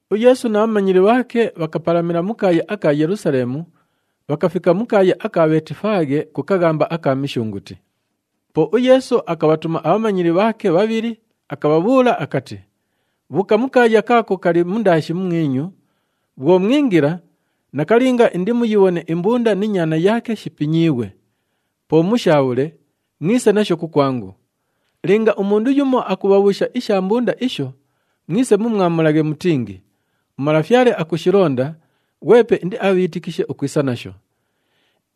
UYeesu na bhamanyili bhaake bhakapalamila mu kaaya aka Yelusaleemu, bhakafika mu kaaya aka Bheetifaaghe ku kaghamba aka Mishunguti. Po uYeesu akabhatuma abhamanyili bhaake bhabhili akabhabhuula akati, “Bhuuka mu kaaya kala kaako kali mundaashi mumwinyu, bhwo mwingila, nakalinga indimuyibhone imbunda ni nyaana yaake shipinyiighwe. Po mushaabhule, mwise nasho kukwangu. Linga umundu yumo akubhabhuusha isha mbunda isho, mwise mumwamulaghe mutingi, ‘UMalafyale akushilonda,’ ghwepe indiabhiitikishe ukwisa nasho.”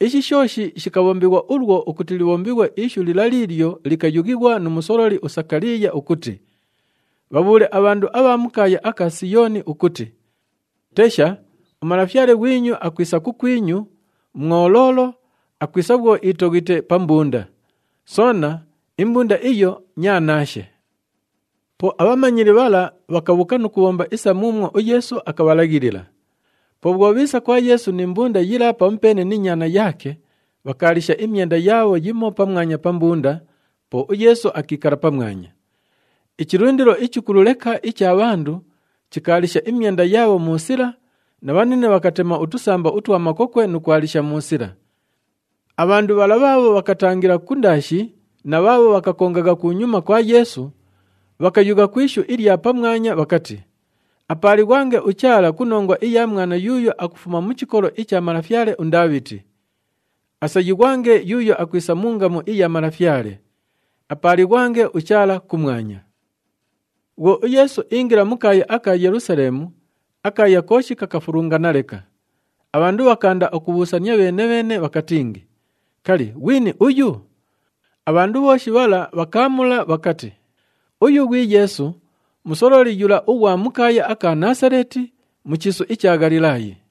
Ishi shooshi shikabhombighwa ulwo ukuti libhombighwe ishu lila liilyo likayughighwa nu musololi uSakaliiya ukuti, “Bhabhuule abhandu abha mu kaaya aka Siyooni ukuti, ‘Tesha, uMalafyale ghwinyu akwisa kukwinyu, mwoloolo, akwisa bhwo iitoghite pa mbunda. Soona, imbunda iyo nyaanaashe.’” Po abhamanyili bhala bhakabhuuka nu kubhomba isa muumwo uYeesu akabhalaghilila. Po bhwo bhiisa kwa Yeesu ni mbunda yila pamupeene ni nyaana yaake, bhakaalisha imyenda yaabho yimo pamwanya pa mbunda, po uYeesu akiikala pamwanya. Ichilundilo ichikulu leka icha bhandu chikaalisha imyenda yaabho mu sila na bhanine bhakatema utusamba utwa makokwe nu kwalisha mu sila. Abhandu bhala bhaabho bhakatangila kundaashi na bhaabho bhakakongagha kunyuma kwa Yeesu, bhakayugha ku ishu ilya pamwanya bhakati, “Apaalighwange uChaala ku nongwa iya mwana yuuyo akufuma mu chikolo icha malafyale uNdaabhiti! Asayighwange yuuyo akwisa mu ngamu iya Malafyale! Apaalighwange uChaala kumwanya!” Bhwo uYeesu iingila mu kaaya aka Yelusaleemu, akaaya kooshi kakafulungana leka. Abhandu bhakaanda ukubhuusania bheene-bheene bhakatingi, “Kali, ghwini uyu?” Abhandu bhooshi bhala bhakaamula bhakati, “Uyu ghwi Yeesu, musololi yula ughwa mu kaaya aka Naasaleeti, mu chiisu icha Ghalilaayi.”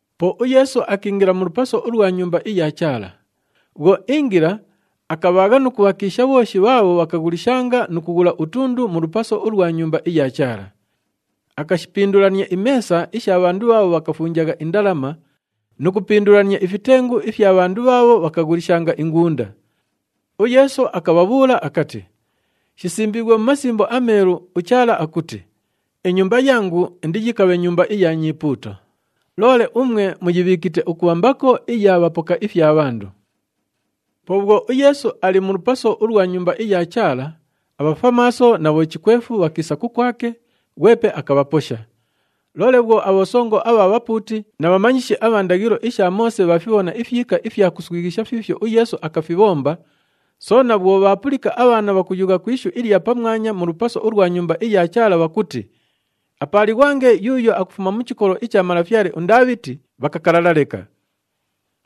Po uYeesu akiingila mu lupaso ulwa Nyumba iya Chaala. Bhwo iingila, akabhaagha nu kubhakiisha bhooshi bhaabho bhakaghulishanga nu kughula utundu mu lupaso ulwa Nyumba iya Chaala. Akashipindulania imeesa isha bhandu bhaabho bhakafunjagha indalama nu kupindulania ifitengu ifya bhandu bhaabho bhakaghulishanga ingunda. UYeesu akabhabhuula akati, “Shisimbiighwe mu Masimbo aMeelu, uChaala akuti, ‘Inyumba yangu indiyikabhe nyumba iya nyipuuto.’ Loole umwe muyibhiikite ukubha mbako iya bhapoka ifya bhandu.” Po bhwo uYeesu ali mu lupaso ulwa Nyumba iya Chaala, abhafwamaaso na bhochikwefu bhakiisa kukwake, ghwepe akabhaposha. Loole bhwo abhosongo abha bhapuuti na bhamanyishi abha ndaghilo isha Moose bhaafibhona ifyika ifya kuswighisha fiifyo uYeesu akafibhomba, soona bhwo bhaapulika abhaana bhakuyugha ku ishu ilya pamwanya mu lupaso ulwa Nyumba iya Chaala bhakuti, “Apaalighwange yuuyo akufuma mu chikolo icha malafyale uNdaabhiti,” bhakakalala leka.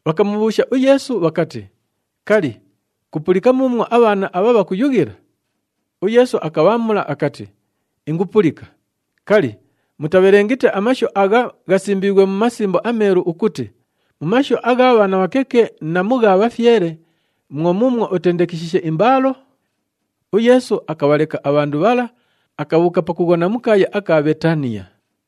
Bhakamubhuusha uYeesu bhakati, “Kali, kupulika muumwo abhaana abha bhakuyughila?” UYeesu akabhaamula akati, “Ingupulika. Kali, mutabhelengite amashu agha ghasimbiighwe mu Masimbo aMeelu ukuti, ‘Mu mashu agha bhaana abhakeke na mu gha bhafyele, mwo muumwo utendekeshiishe imbaalo’?” UYeesu akabhaleka abhandu bhala, akabhuuka pakughona mu kaaya aka Bheetaniya.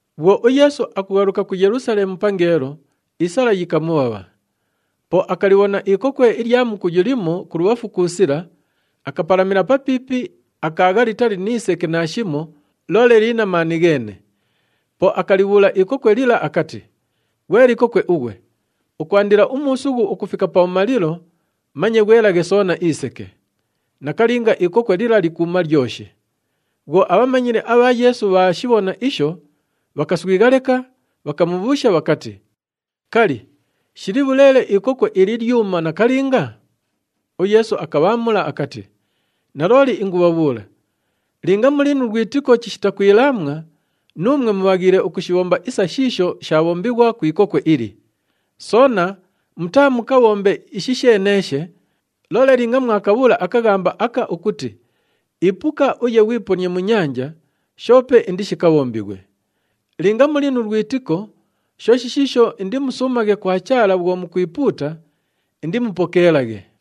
Bhwo uYeesu akughaluka ku Yelusaleemu pangeelo, isala yikamubhabha. Po akalibhona ikokwe ilya mukuyu limo kulubhafu ku sila, akapalamila papiipi, akaagha litali ni seke naashimo, loole lili na maani gheene. Po akalibhuula ikokwe lila akati, “Ghwe likokwe ughwe, ukwandila umuusughu ukufika pabhumalilo, manye ghwelaghe soona iseke!” Nakalinga, ikokwe lila likuuma lyoshi. Bhwo abhamanyili abha Yeesu bhaashibhona isho, bhakaswigha leka, bhakamubhuusha bhakati, “Kali, shili bhuleele ikokwe ili lyuma nakalinga?” UYeesu akabhaamula akati, “Nalooli ingubhabhuula, linga muli nu lwitiko chishita kwilaamwa, nuumwe mubhaghiile ukushibhomba isa shiisho shaabhombighwa ku ikokwe ili. Soona mutaamukabhombe ishi sheeneeshe, loole linga mwakabhuula akaghamba aka ukuti, ‘Ipuka uye ghwiponie mu nyanja,’ shoope indishikabhombighwe. Linga muli nu lwitiko, shooshi shiisho indimusuumaghe kwa Chaala bhwo mukwipuuta, indimupokeelaghe.”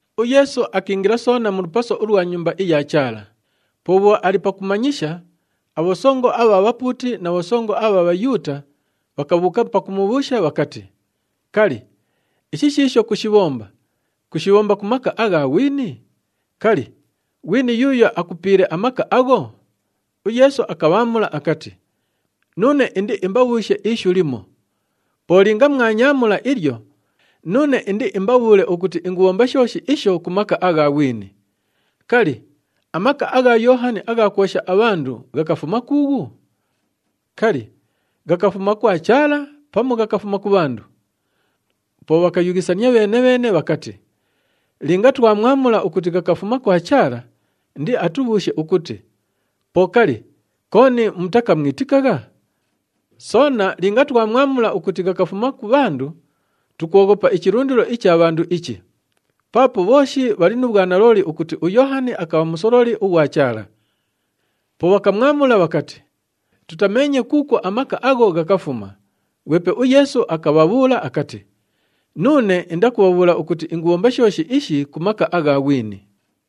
UYeesu akiingila soona mu lupaso ulwa Nyumba iya Chaala. Po bhwo ali pakumanyisha, abhosongo abha bhapuuti na bhosongo abha Bhayuuta bhakabhuuka pakumubhuusha bhakati, “Kali, ishi shiisho kushibhomba, kushibhomba ku maka agha ghwini? Kali, ghwini yuuyo akupiile amaka agho?” UYeesu akabhaamula akati, “Nuune indiimbabhuushe ishu limo. Po linga mwanyaamula ilyo, nuune indiimbabhuule ukuti ingubhomba shooshi isho ku maka agha ghwini. Kali, amaka agha Yoohani agha kwosha abhandu ghakafuma kuughu? Kali, ghakafuma kwa Chaala pamu ghakafuma ku bhandu?” Po bhakayughisania bheene-bheene bhakati, “Linga twamwamula ukuti ghakafuma kwa Chaala, indiatubhuushe ukuti, ‘Po kali, kooni mutakamwitikagha?’ Soona linga twamwamula ukuti ghakafuma ku bhandu, tukwoghopa ichilundilo icha bhandu ichi. Paapo bhooshi bhali nu bhwanalooli ukuti uYoohani akabha musololi ughwa Chaala.” Po bhakamwamula bhakati, “Tutameenye kuukwo amaka agho ghakafuma.” Ghwepe uYeesu akabhabhuula akati, “Nuune indakubhabhuula ukuti ingubhomba shooshi ishi ku maka agha ghwini.”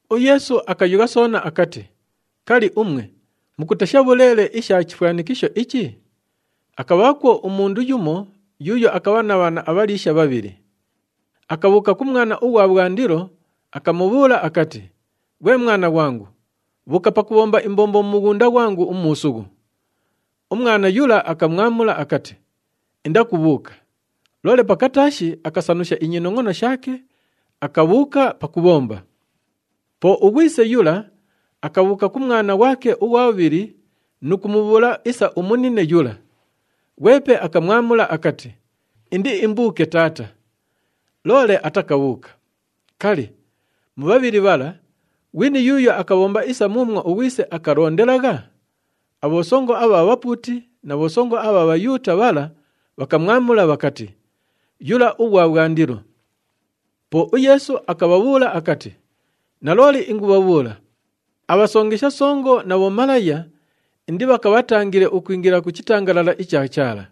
UYeesu akayugha soona akati, “Kali, umwe mukutesha bhuleele isha chifwanikisho ichi? Akabhaakwo umundu yumo yuuyo akabha na bhaana abhaliisha bhabhili. Akabhuuka ku mwana ughwa bhwandilo, akamubhuula akati, ‘Ghwe mwana ghwangu, bhuuka pakubhomba imbombo mu mughunda ghwangu umuusughu.’ Umwana yula akamwamula akati, ‘Indakubhuuka.’ Loole pakataashi akasanusha inyinongʼono shaake, akabhuuka pakubhomba. Po ughwise yula akabhuuka ku mwana ghwake ughwa bhubhili nu kumubhuula isa umunine yula. Ghwepe akamwamula akati, ‘Indiimbuuke taata.’ Loole atakabhuuka. Kali, mu bhabhili bhala, ghwini yuuyo akabhomba isa muumwo ughwise akalondelagha?” Abhosongo abha bhapuuti na bhosongo abha Bhayuuta bhala bhakamwamula bhakati, “Yula ughwa bhwandilo.” Po uYeesu akabhabhuula akati, “Nalooli ingubhabhuula, abhasongesha songo na bhomalaya indibhakabhatangile ukwingila ku chitangalala icha Chaala.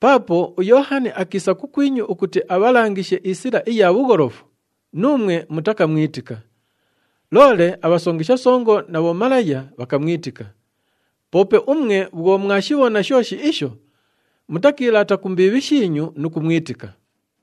Paapo uYoohani akiisa kukwinyu ukuti abhalangishe isila iya bhugholofu, nuumwe mutakamwitika. Loole abhasongesha songo na bhomalaya bhakamwitika. Poope umwe bhwo mwashibhona shooshi isho, mutakiilaata ku mbiibhi shiinyu nu kumwitika.”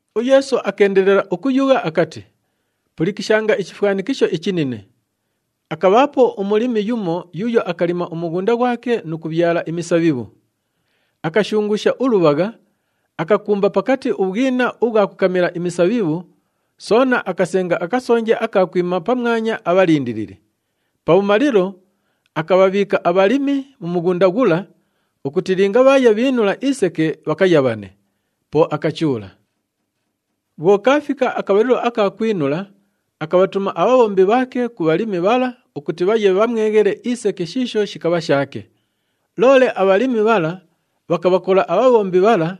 UYeesu akeendelela ukuyugha akati, “Pulikishanga ichifwanikisho ichinine. Akabhaapo umulimi yumo yuuyo akalima umughunda ghwake nu kubhyala imisabhibhu. Akashunguusha ulubhagha, akakumba pakati ubhwina ubhwa kukamila imisabhibhu, soona akasenga akasonje aka kwima pamwanya abhalindilili. Pabhumalilo, akabhabhiika abhalimi mu mughunda ghula ukuti linga bhaaya bhiinula iseke bhakayabhane. Po akachuula. “Bhwo kaafika akabhalilo aka kwinula, akabhatuma abhabhombi bhaake ku bhalimi bhala ukuti bhaye bhamweghele iseke shiisho shikabha shaake. Loole abhalimi bhala bhakabhakola abhabhombi bhala,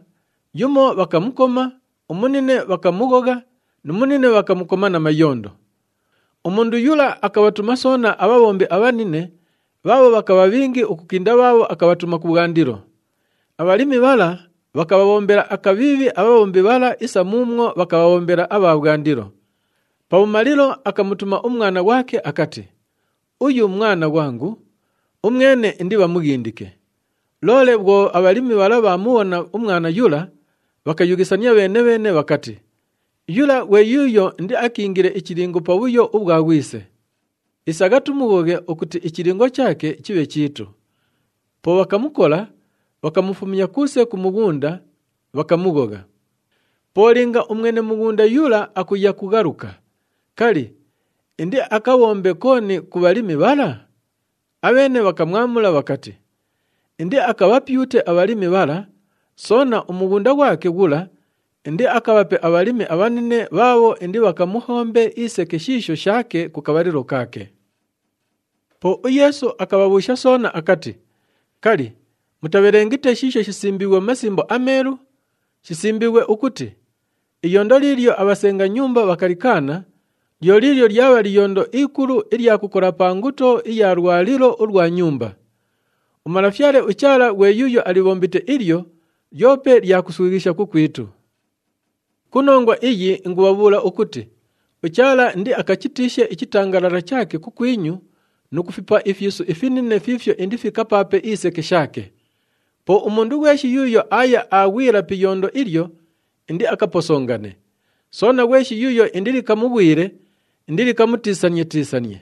yumo bhakamukoma, umunine bhakamughogha nu munine bhakamukoma na mayondo. Umundu yula akabhatuma soona abhabhombi abhanine bhaabho bhakabha bhingi ukukinda bhaabho akabhatuma kubhwandilo. Abhalimi bhala bhakabhabhombela akabhiibhi abhabhombi bhala isa muumwo bhakabhabhombela abha bhwandilo. Pabhumalilo, akamutuma umwana ghwake akati, ‘Uyu mwana ghwangu, umwene indibhamughindike.’ Loole bhwo abhalimi bhala bhaamubhona umwana yula, bhakayughisania bheene-bheene bhakati, ‘Yula, ghwe yuuyo indiakiingile ichilingo pa bhuyo ubhwa ghwise. Isagha tumughoghe ukuti ichilingo chaake chibhe chiitu.’ Po bhakamukola, bhakamufumya kuuse ku mughunda, bhakamughogha. Po linga umwene mughunda yula akuya kughaluka, kali, indiakabhombe kooni ku bhalimi bhala?” Abheene bhakamwamula bhakati, “Indiakabhapyute abhabhiibhi bhala, soona umughunda ghwake ghula indiakabhape abhalimi abhanine bhaabho indibhakamuhombe iseke shiisho shaake ku kabhalilo kaake.” Po uYeesu akabhabhuusha soona akati, “Kali, mutabhelengite shiisho shisimbiighwe mu Masimbo aMeelu? Shisimbiighwe ukuti, ‘Iyondo liilyo abhasenga nyumba bhakalikaana, lyo liilyo lyabha liyondo ikulu ilya kukola pa nguto iya lwalilo ulwa nyumba. UMalafyale uChaala ghwe yuuyo alibhombite ilyo, lyope lya kuswighisha kukwitu.’ “Ku nongwa iyi, ingubhabhuula ukuti uChaala indiakachitiishe ichitangalala chaake kukwinyu nu kufipa ifyisu ifinine fiifyo indifikapaape iseke shaake. Po umundu ghweshi yuuyo aaya aaghwila pi iyondo ilyo, indiakaposongane. Soona, ghweshi yuuyo indilikamughwile, indilikamutiisanie-tiisanie.”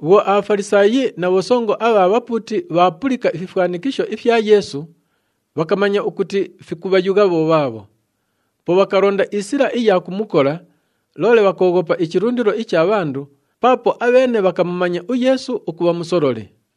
Bhwo aBhafalisaayi na bhosongo abha bhapuuti bhaapulika ififwanikisho ifya Yeesu, bhakamanya ukuti fikubhayugha bho bhaabho. Po bhakalonda isila iya kumukola, loole bhakooghopa ichilundilo icha bhandu paapo abheene bhakamumanya uYeesu ukubha musololi.